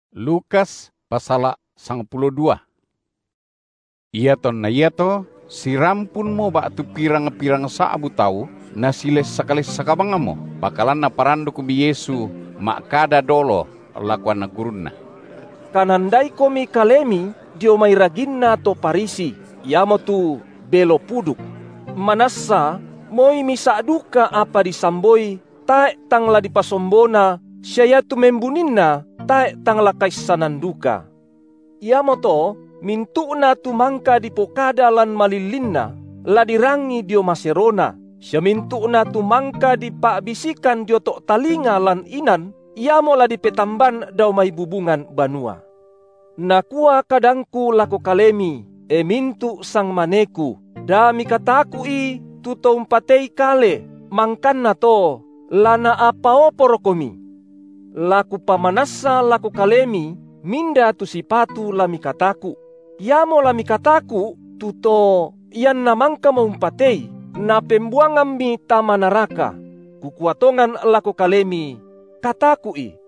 Mindara tu sipatu dikataku’ Iatonna iato sirampunmo ba’tu pirang-pirang sa’bu tau, nasilessak-lessak bangmo, pakalan Naparandukmi Yesu ma’kada dolo lako anak gurunNa: Kanandaikomi kalemi dio mai raginna to Farisi, iamotu belo puduk. Manassa moi misa’ duka apa disamboi, tae’ tang la dipasombona sia iatu membuninna, tae’ tang la kaissanan duka. Iamoto mintu’na tu mangka dipokada lan malillinna, la dirangi dio maserona, sia mintu’na tu mangka dipa’bisikan dio to’ talinga lan inan, iamo la dipetamban dao mai bubungan banua. Nakua kadangKu lako kalemi, e mintu’ sangmaneKu, da mikataku’i tu to umpatei kale, mangkanna to, la naapaoporokomi; la Kupamanassa lako kalemi, minda tu sipatu la mikataku’: Iamo la mikataku’ tu To, ianna mangkamo umpatei, Napembuangammi tama naraka; Kukua tongan lako kalemi: kataku’I.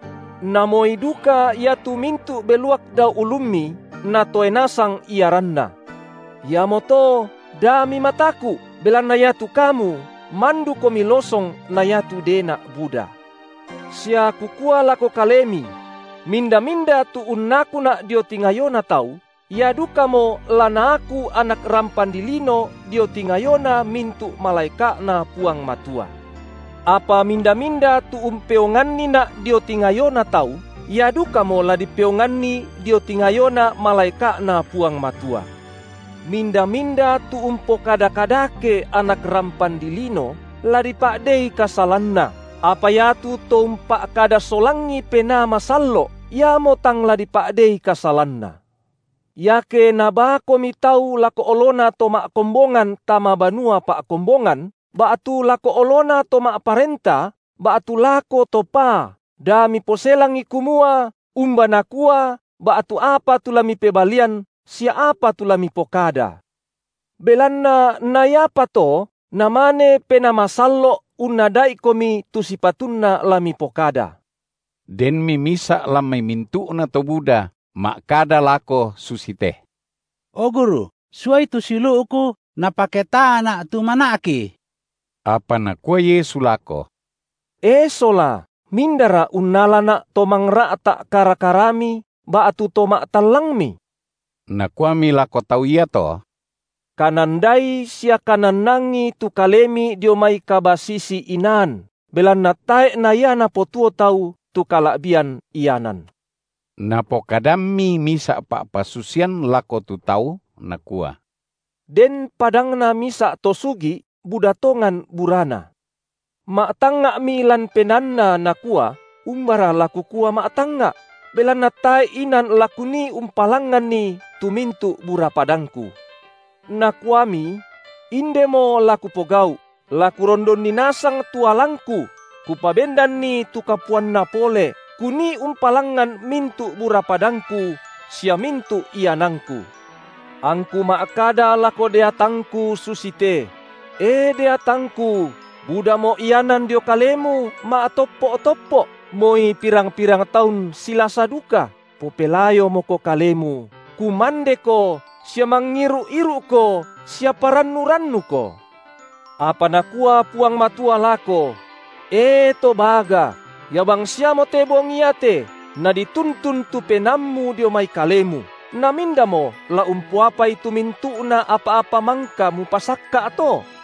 Namoi duka iatu mintu’ beluak dao ulummi Natoe nasang iaranna. Iamoto da mimataku’, belanna iatu kamu mandukomi losong na iatu dena’ buda. Sia Kukua lako kalemi: Minda-minda tu unnakuNa’ dio tingayona tau, ia dukamo la Naaku Anak rampan dilino dio tingayona mintu’ malaeka’Na Puang Matua; apa minda-minda tu umpeonganniNa’ dio tingayona tau, ia dukamo la dipeonganni dio tingayona malaeka’Na Puang Matua. Minda-minda tu umpokada kadake Anak rampan dilino, la dipa’dei kasalanna, apa iatu to umpa’kada solangi Penaa Masallo’, iamo tang la dipa’dei kasalanna. Pa’tunduanNa Penaa Masallo’ Iake nabaakomi tau lako olona to ma’kombongan tama banua pa’kombongan, ba’tu lako olona to ma’parenta, ba’tu lako to paa, da miposelangi kumua umba nakua ba’tu apa tu la mipebalian sia apa tu la mipokada; belanna na iapa to, Namane Penaa Masallo’ unnada’ikomi tu sipatunna la mipokada. Denmi misa’ lan mai mintu’nato buda ma’kada lako susite: O Guru, suai tu siulu’ku napaketaana’ tu mana’ki! Apa nakua Yesu lako: E sola, mindara unnalaNa’ to mangra’ta’ kara-karami ba’tu to ma’tallangmi? Nakuami lako tau iato: Kanandai sia kanannangi tu kalemi dio mai kabasisi-inaan, belanna tae’ na ia napotuo tau tu kala’bian ianan. Napokadammi misa’ pa’pasusian lako tu tau, Nakua: Den padangna misa’ to sugi’ buda tongan burana. Ma’tangnga’mi lan penaanna, nakua: Umbara la kukua ma’tangnga’? belanna tae’ inan la kunii umpalangnganni tu mintu’ bura padangku. Nakuami: Indemo la kupogau’; la kurondonni nasang tu alangku, kupabendanni tu kapuanna pole, kunii umpalangan mintu’ bura padangku sia mintu’ iananku; angku ma’kada lako deatangku susite: E deatangku, budamo ianan dio kalemu ma’toppo’-toppo’, moi pirang-pirang taun silasa duka, popelayomoko kalemu, kumandeko sia mangiru’-iru’ko sia parannu-rannuko. Apa Nakua Puang Matua lako: E to baga, ia bangsiamote bongi iate nadituntun tu penaammu dio mai kalemu, namindamo la umpoapai tu mintu’na apa-apa mangka mupasakka’ to?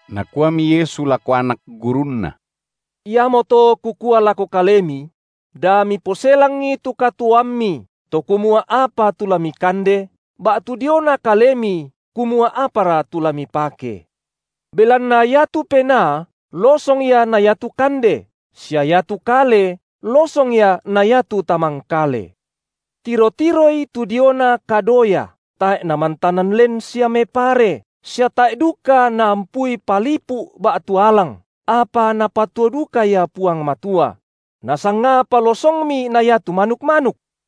Nakuami Yesu lako anak gurunNa: Iamoto Kukua lako kalemi: da miposelangi tu katuoammi, to kumua apa tu la mikande, ba’tu diona kalemi kumua apara tu la mipake. Belanna iatu penaa losong ia na iatu kande, sia iatu kale losong ia na iatu tamangkale. Tiro-tiroi tu diona kadoya, tae’ namantanan len sia mepare, sia tae’ duka naampui palipu’ ba’tu alang, apa Napatuo duka ia Puang Matua; nasangapa losongmi na iatu manuk-manuk!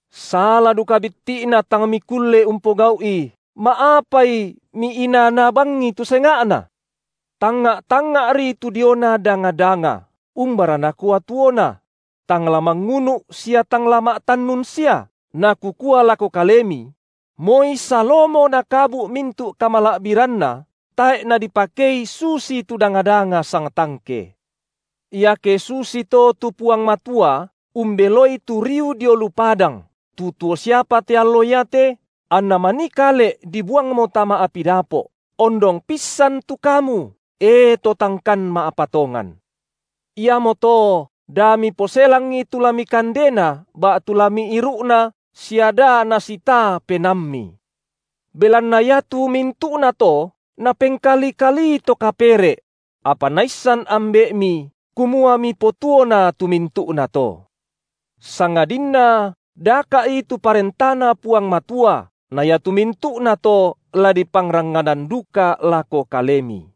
Sala duka bitti’na tang mikulle umpogau’i, ma’apai miinaa-naa bangi tu senga’na? Tangnga’-tangnga’ri tu diona danga-danga, umbara nakua tuona; tang la mangunu’ sia tang la ma’tannun sia, na Kukua lako kalemi: Moi Salomo nakabu’ mintu’ kamala’biranna tae’ nadipakei susitu danga-danga sangtangke. Iake susito tu Puang Matua umbeloi tu riu dio lu padang, tu tuo siapa te allo iate, anna manikale’ dibuangmo tama api dapo’, ondong pissan tu kamu, e to tangkan ma’patongan! Iamoto da miposelangi tu la mikandena ba’tu la miiru’na sia da nasitaa penaammi; belanna iatu mintu’nato, napengkali-kalii to kapere’; apa Naissan Ambe’mi, kumua mipotuona tu mintu’nato. Sangadinna daka’i tu ParentaNa Puang Matua na iatu mintu’na to la dipangranganan duka lako kalemi.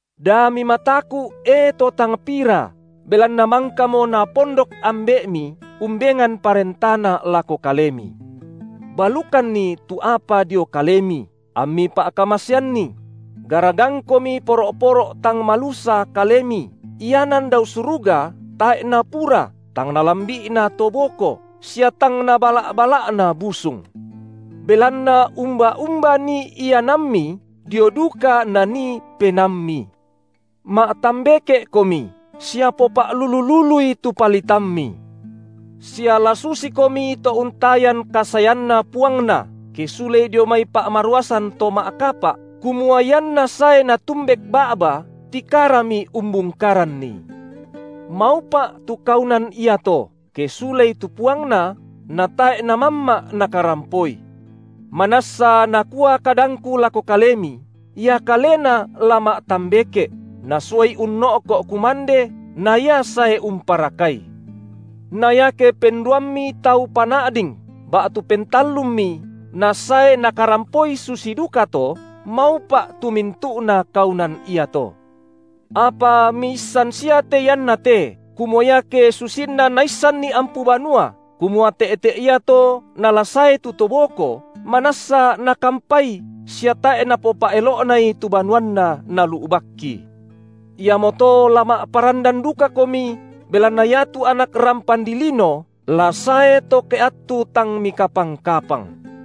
Da mimataku’ e to tang pira, belanna mangkamo Napondok Ambe’mi umbengan ParentaNa lako kalemi. Balukanni tu apa dio kalemi, ammi pa’kamaseanni; garagangkomi poro’-poro’ tang malusa kalemi, ianan dao suruga tae’ napura, tang nalambi’na to boko, sia tang nabala’-bala’na busung. Belanna umba-umba nii ianammi, dio duka nanii penaammi. Ma’tambeke’komi, sia popa’lulu-lului tu palitammi. Sia la susikomi to untayan kasaeanna puangna, ke sulei dio mai pa’maruasan to ma’kapa’, kumua ianna sae natumbek ba’ba, tikarami umbungkaranni. Maupa’ tu kaunan iato, ke sulei tu puangna, natae’ namamma’ nakarampoi. Manassa nakua kadangKu lako kalemi, ia kalena la ma’tambeke’, nasuai unno’ko’ kumande na ia sae umparakai. Na iake penduammi tau pana’ding ba’tu pentallummi nasae nakarampoi susi dukato, maupa’ tu mintu’na kaunan iato. Apa miissan sia te iannate, kumua iake susinna naissanni ampu banua, kumua te’te’ iato nala sae tu to boko, manassa nakampai sia tae’ napopa’elo’nai tu banuanna nalu’bakki. Iamoto la ma’parandan dukakomi, belanna iatu Anak rampan dilino la sae to ke attu tang mikapang-kapang.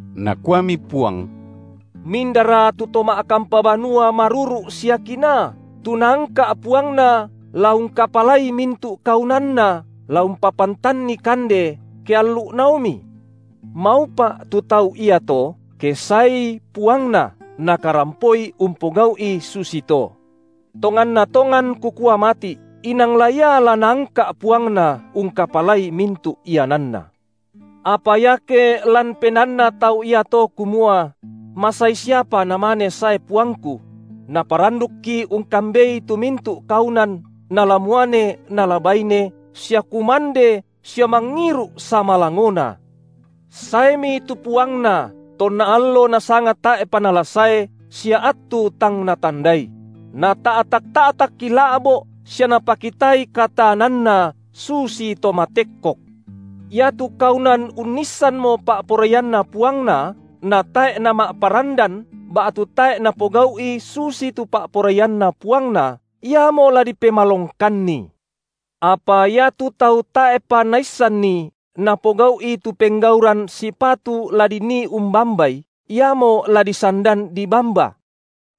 Nakuami Puang: Mindara tu to ma’kampa banua maruru’ sia kinaa, tu naangka’ puangna la ungkapalai mintu’ kaunanna, la umpapantanni kande, ke allu’naomi? Maupa’ tu tau iato, ke saei puangna, nakarampoi umpogau’i susito. Tonganna tongan Kukua mati’, inang la ia la naangka’ puangna ungkapalai mintu’ iananna. Apa iake ia lan penaanna tu tau iato, kumua: masai siapa namane sae puangku; naparandukki ungkambei tu mintu’ kaunan, nala muane, nala baine, sia kumande sia mangiru’ samalangona; saemi tu puangna tonna allo nasanga tae’pa nala sae sia attu tang natandai: nata’tak-ta’takki la’bo’ sia napakitai kataananna susito matekkok. Iatu kaunan unnissanmo pa’poraianna puangna, natae’ nama’parandan ba’tu tae’ napogau’i susitu pa’poraianna puangna, iamo la dipemalongkanni. Apa iatu tau tae’pa naissanni, napogau’i tu penggauran sipatu la dinii umbambai, iamo la disandan dibamba.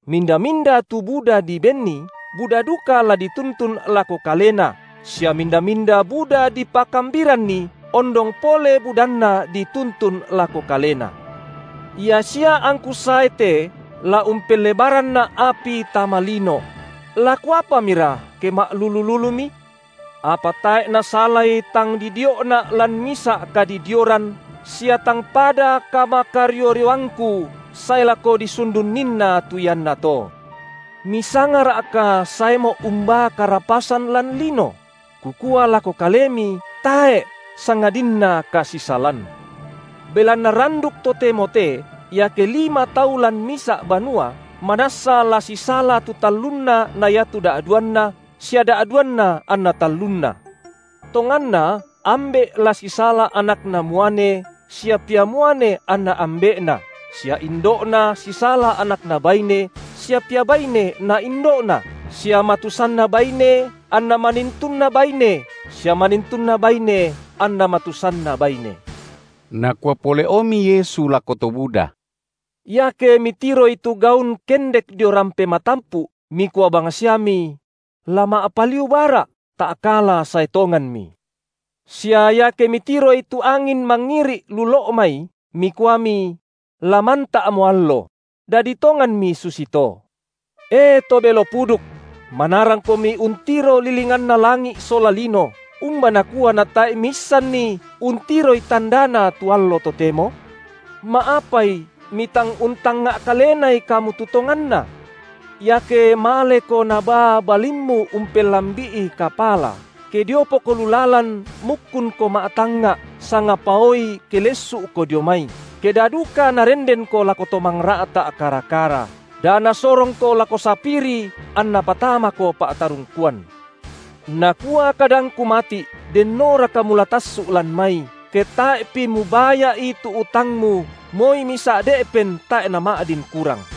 Minda-minda tu buda dibenni, buda duka la dituntun lako kalena, sia minda-minda buda dipakambiranni, ondong pole budanna dituntun lako kalena. Ia sia angKu sae te la umpellebaranNa’ api tama lino; la Kuapamira ke ma’lulu-lulumi? Apa tae’ nasalai tang didio’Na’ lan misa’ kadidioran sia tang pada kamakario-rioangKu sae lako disundunninna tu iannato. MisangaRa’ka saeMo’ umbaa karapasan lan lino? Kukua lako kalemi, tae’, sangadinna kasisalan. Belanna randuk totemo te, iake lima tau lan misa’ banua, manassa la sisala tu tallunna na iatu da’duanna sia da’duanna anna tallunna; tonganna ambe’ la sisala anakna muane sia pia muane anna ambe’na, sia indo’na sisala anakna baine sia pia baine na indo’na, sia matusanna baine anna manintunna baine sia manintunna baine anna matusanna baine. Nakua pole’omi Yesu lako to buda: Iake mitiroi tu gaun kendek dio rampe matampu’, mikua bangsiami: la ma’paliu bara’; ta’kala sae tonganmi. Sia iake mitiroi tu angin mangiri’ lu lo’ mai, mikuami: la manta’mo allo; dadi tonganmi susito. E to belo puduk! manarangkomi untiro lilinganna langi’ sola lino, umba nakua natae’ miissanni untiroi tandana tu allo totemo? Ma’apai mitang untangnga’ kalenai kamu tu tonganna? Iake maleko nabaa balimmu umpellambi’i kapala, ke diopoko lu lalan mukkunko ma’tangnga’, sangapaoi ke lessu’ko dio mai, ke da duka narendenko lako to mangra’ta’ kara-kara, da nasorongoko lako sapiri anna patamako pa’tarungkuan. Nakua kadangKu mati’: dennoraka mula tassu’ lan mai, ke tae’pi mubaya’i tu utangmu moi misa’ de’pen tae’ nama’din kurang.